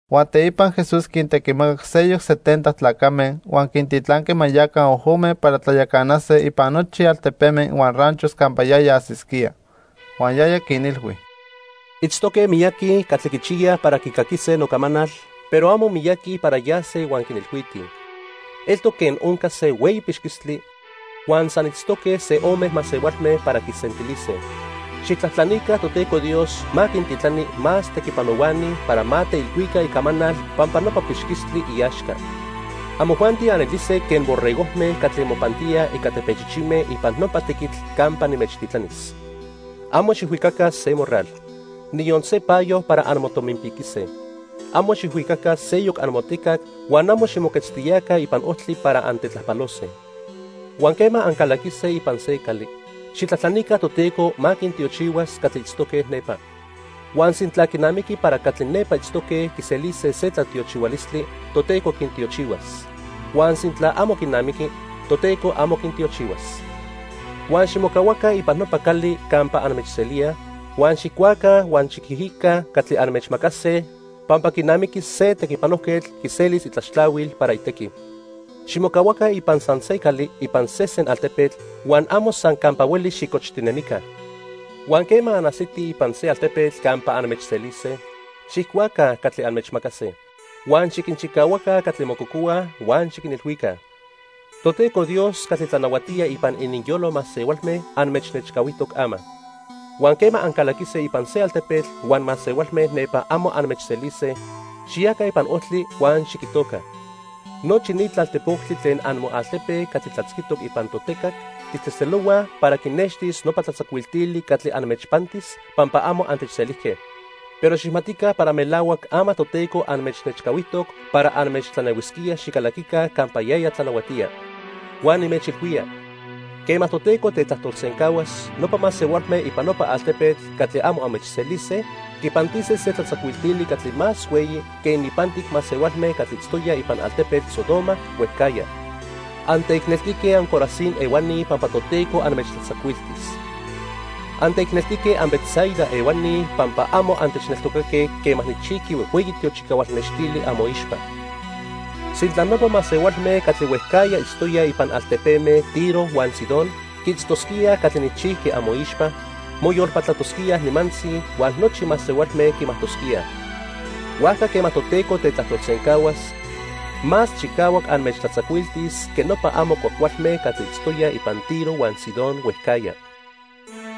Huan teipa Jesús quintequimacac seyoc setenta tlacame huan quintitlanqui ma yaca ojome para tlayacanase ipan nochi altepeme huan ranchos campa yaya ajsisquía. Huan yaya quinilhui: "Itztoque miyaqui catli quichiyaj para quicaquise nocamanal, pero amo miyaqui para yase huan quinilhuitij. Eltoc quen onca se hueyi pixquistli huan san itztoque se o ome masehualme para quisentilise. Xijtlajtlanica Toteco Dios ma quintitlani más tequipanohuani para ma teilhuica icamanal pampa nopa pixquistli iaxca. Amojuanti anelise quen borregojme catli mopantíaj ica tepechichime ipan nopa tequitl campa nimechtitlanis. Amo xijhuicaca se morral, niyon se payo para anmotominpiquise. Amo xijhuicaca seyoc amotecac huan amo ximoquetztiyaca ipan ojtli para antetlajpalose. Huan quema ancalaquise ipan se cali, xijtlajtlanica Toteco ma quintiochihuas catli itztoque nepa. Huan sintla quinamiqui para catli nepa itztoque quiselise se tlatiochihualistli, Toteco quintiochihuas. Huan sintla amo quinamiqui, Toteco amo quintiochihuas. Huan ximocahuaca ipan nopa cali campa anmechselíaj, huan xijcuaca huan xiquijica catli anmechmacase pampa quinamiqui se tequipanojquetl quiselis itlaxtlahuil para itequi. Ximocahuaca ipan san se cali ipan sesen altepetl, huan amo san campa hueli xicochtinemica. Huan quema anajsitij ipan se altepetl campa anmechselise, xijcuaca catli anmechmacase. Huan xiquinchicahuaca catli mococohuaj huan xiquinilhuica: 'Toteco Dios catli tlanahuatía ipan ininyolo masehualme anmechnechcahuijtoc ama.' Huan quema ancalaquise ipan se altepetl huan masehualme nepa amo anmechselise, xiyaca ipan ojtli huan xiquijtoca: 'Nochi ni tlaltejpoctli tlen amoaltepe catli tlatzquitoc ipan totecac tijtzejtzelohuaj para quinextis nopa tlatzacuiltili catli anmechpantis pampa amo antechselijque. Pero xijmatica para melahuac ama Toteco anmechnechcahuijtoc para anmechtlanehuisquía xicalaquica campa yaya tlanahuatía.' Huan nimechilhuía, quema Toteco tetlajtolsencahuas, nopa masehualme ipan nopa altepetl catli amo anmechselise, quinpantise se tlatzacuiltili catli más hueyi que ininpantic masehualme catli itztoyaj ipan altepetl Sodoma huejcajya. "Anteicneltique anCorazín ehuani pampa Toteco anmechtlatzacuiltis. Anteicneltique anBetsaida ehuani, pampa amo antechneltocaque quema nijchijqui huejhueyi tiochicahual nextili amoixpa. Sintla nopa masehualme catli huejcajya itztoyaj ipan altepeme Tiro huan Sidón quiitztosquíaj catli nijchijqui amoixpa, moyolpatlatosquíaj nimantzi, huan nochi masehualme quimajtosquíaj. Huajca quema Toteco tetlajtolsencahuas, más chicahuac anmechtlatzacuiltis que nopa amo cuajcualme catli itztoyaj ipan Tiro huan Sidón huejcajya.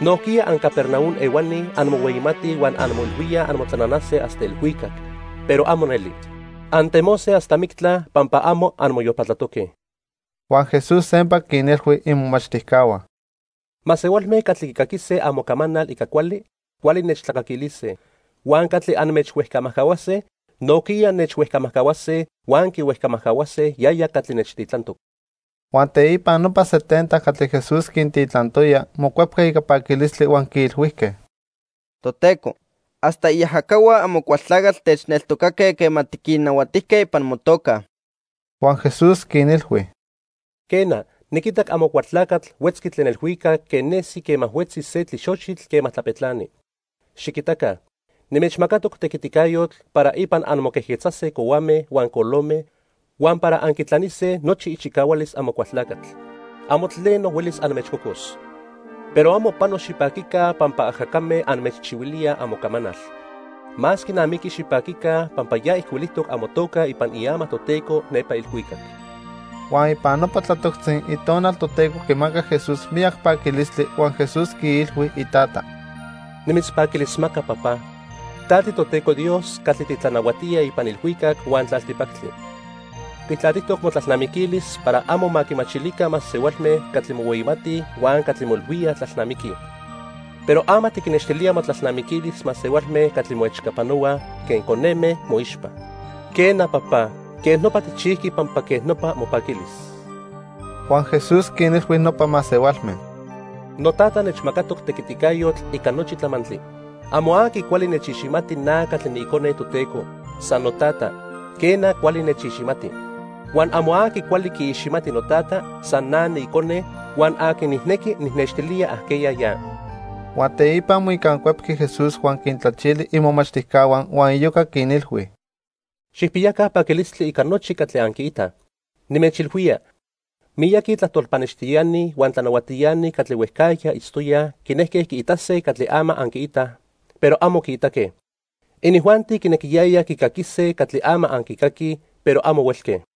Nojquiya anCapernaum ehuani anmohueyimatij huan anmoilhuíaj anmotlananase hasta ilhuicac, pero amo neli. Antemose hasta mictla pampa amo anmoyolpatlatoque." Huan Jesús sempa quinilhui imomachtijcahua: —Masehualme catli quicaquise amocamanal ica cuali, cuali nechtlacaquilise, huan catli anmechhuejcamajcahuase, nojquiya nechhuejcamajcahuase huan quihuejcamajcahuase yaya catli nechtitlantoc. Huan teipa nopa setenta catli Jesús quintitlantoya mocuepque ica paquilistli huan quiilhuijque: —Toteco, hasta iajacahua Amocualtlacatl techneltocaque quema tiquinnahuatijque ipan motoca. Huan Jesús quinilhui: —Quena, niquitac Amocualtlacatl huetzqui tlen ilhuicac quen nesi quema huetzi se tlixochitl quema tlapetlani. Xiquitaca, nimechmacatoc tequiticayotl para ipan anmoquejquetzase cohuame huan colome, huan para anquitlanise nochi ichicahualis Amocualtlacatl. Amo tleno huelis anmechcocos. Pero amo pano xipaquica pampa ajacame anmechchihuilíaj amocamanal. Más quinamiqui xipaquica pampa ya ijcuilijtoc amotoca ipan iama Toteco nepa ilhuicac. Huan ipan nopa tlatoctzi Itonal Toteco quimacac Jesús miyac paquilistli huan Jesús quiilhui iTata: "Nimitzpaquilismaca, Papá, ta tiToteco Dios catli titlanahuatía ipan ilhuicac huan tlaltipactli. Tijtlatijtoc motlalnamiquilis para amo ma quimachilica masehualme catli mohueyimatij huan catli moilhuíaj tlalnamiquij. Pero ama tiquinnextilía motlalnamiquilis masehualme catli moechcapanohuaj quen coneme moixpa. Quena, Papá, quej nopa tijchijqui pampa quej nopa mopaquilis." Huan Jesús quinilhui nopa masehualme: "Notata nechmacatoc tequiticayotl ica nochi tlamantli. Amo aqui cuali nechiximati na catli niIcone Toteco, san Notata, quena, cuali nechiximati. Huan amo aqui cuali quiiximati noTata, san na niIcone huan aqui nijnequi nijnextilía ajqueya ya." Huan teipa moicancuepqui Jesús huan quintlachili imomachtijcahua huan iyoca quinilhui: "Xijpiyaca paquilistli ica nochi catli anquiitaj. Nimechilhuía, miyaqui tlajtol pannextiani huan tlanahuatiani catli huejcajya itztoyaj quinejque quiitase catli ama anquiitaj, pero amo quiitaque. Inijuanti quinequiyayaj quicaquise catli ama anquicaquij, pero amo huelque."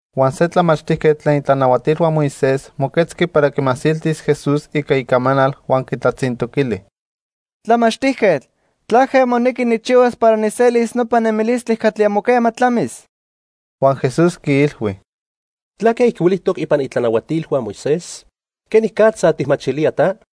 Huan se tlamachtijquetl tlen itlanahuatilhua Moisés moquetzqui para quimasiltis Jesús ica icamanal huan quitlatzintoquili: —Tlamachtijquetl, ¿tlaque monequi nijchihuas para nijselis nopa nemilistli catli amo quema tlamis? Huan Jesús quiilhui: —¿Tlaque ijcuilijtoc ipan itlanahuatilhua Moisés? ¿Quenicatza tijmachilía ta?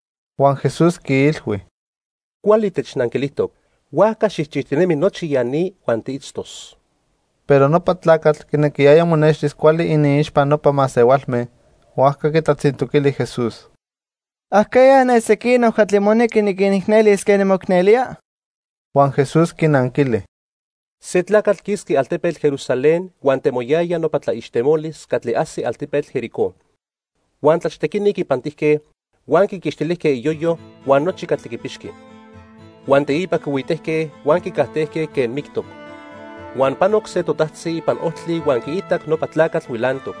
Huan Jesús quiilhui: —Cuali technanquilijtoc. Huajca xijchijtinemi nochi ya ni huan tiitztos. Pero nopa tlacatl quinequiyaya monextis cuali iniixpa nopa masehualme, huajca quitlatzintoquili Jesús: —¿Ajqueya ne sequinoc catli monequi niquinicnelis quen nimoicnelía? Huan Jesús quinanquili: —Se tlacatl quisqui altepetl Jerusalén huan temoyaya nopa tlaixtemolis catli ajsi altepetl Jericó. Huan tlachtequini quipantijque, huan quiquixtilijque iyoyo huan nochi catli quipixqui. Huan teipa quihuitejque huan quicajtejque quen mictoc. Huan panoc se totajtzi ipan ojtli huan quiitac nopa tlacatl huilantoc,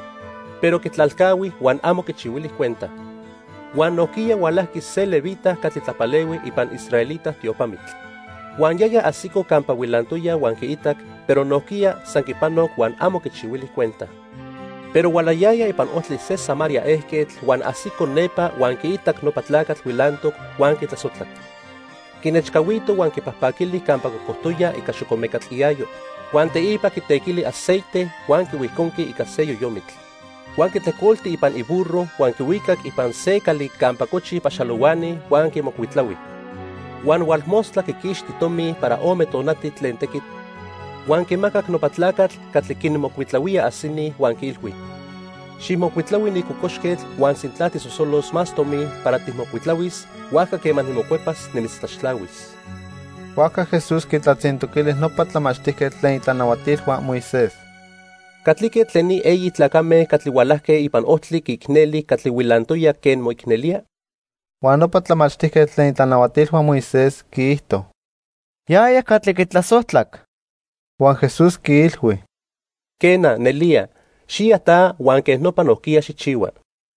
pero quitlalcahui huan amo quichihuili cuenta. Huan nojquiya hualajqui se levita catli tlapalehui ipan israelita tiopamitl. Huan yaya ajsico campa huilantoya huan quiitac, pero nojquiya san quipanoc huan amo quichihuili cuenta. Pero hualayaya ipan ojtli se Samaria ejquetl, huan ajsico nepa huan quiitac nopa tlacatl huilantoc, huan quitlasojtlac. Quinechcahuito huan quipajpaquili campa cocojtoya ica xocomecatl iayo, huan teipa quitequili aceite huan quihuijconqui ica se yoyomitl. Huan quitlejcolti ipan iburro huan quihuicac ipan se cali campa cochij paxalohuani huan quimocuitlahui. Huan hualmostla quiquixti tomi para ome tonati tlen tequitl, huan quimacac nopa tlacatl catli quinmocuitlahuía ajsini huan quiilhui: 'Xijmocuitlahui ni cocoxquetl huan sintla tijsosolos más tomi para tijmocuitlahuis, huajca quema nimocuepas, nimitztlaxtlahuis.' Huajca Jesús quitlatzintoquili nopa tlamachtijquetl tlen itlanahuatilhua Moisés: —¿Catlique tlen ni eyi tlacame catli hualajque ipan ojtli quiicneli catli huilantoya quen moicnelía? Huan nopa tlamachtijquetl tlen itlanahuatilhua Moisés quiijto: —Yaya catli quitlasojtlac. Huan Jesús quiilhui: —Quena, nelía. Xiya ta huan quej nopa nojquiya xijchihua.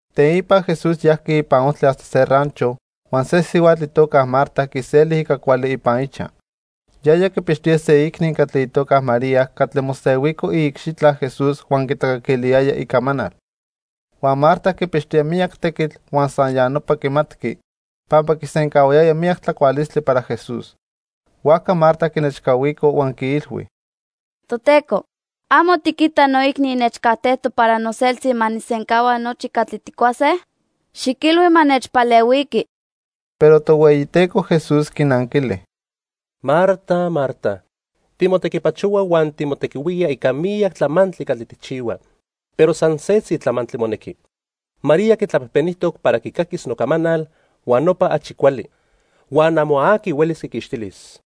Teipa Jesús yajqui ipan ojtli hasta se rancho, huan se sihuatl itoca Marta quiseli ica cuali ipan ichaj. Yaya quipixtoya se iicni catli itoca María catli mosehuico iicxitla Jesús huan quitlacaquiliyaya icamanal. Huan Marta quipixtoya miyac tequitl huan san ya nopa quimatqui, pampa quisencahuayaya miyac tlacualistli para Jesús. Huajca Marta quinechcahuico huan quiilhui: —Toteco, ¿amo tiquita noicni nechcajtejtoc para noseltzi ma nijsencahua nochi catli tijcuase? Xiquilhui ma nechpalehuiqui. Pero Tohueyiteco Jesús quinanquili: —Marta, Marta, timotequipachohua huan timotequihuía ica miyac tlamantli catli tijchihua, pero san setzi tlamantli monequi. María quitlapejpenijtoc para quicaquis nocamanal, huan nopa achi cuali, huan amo aqui huelis quiquixtilis.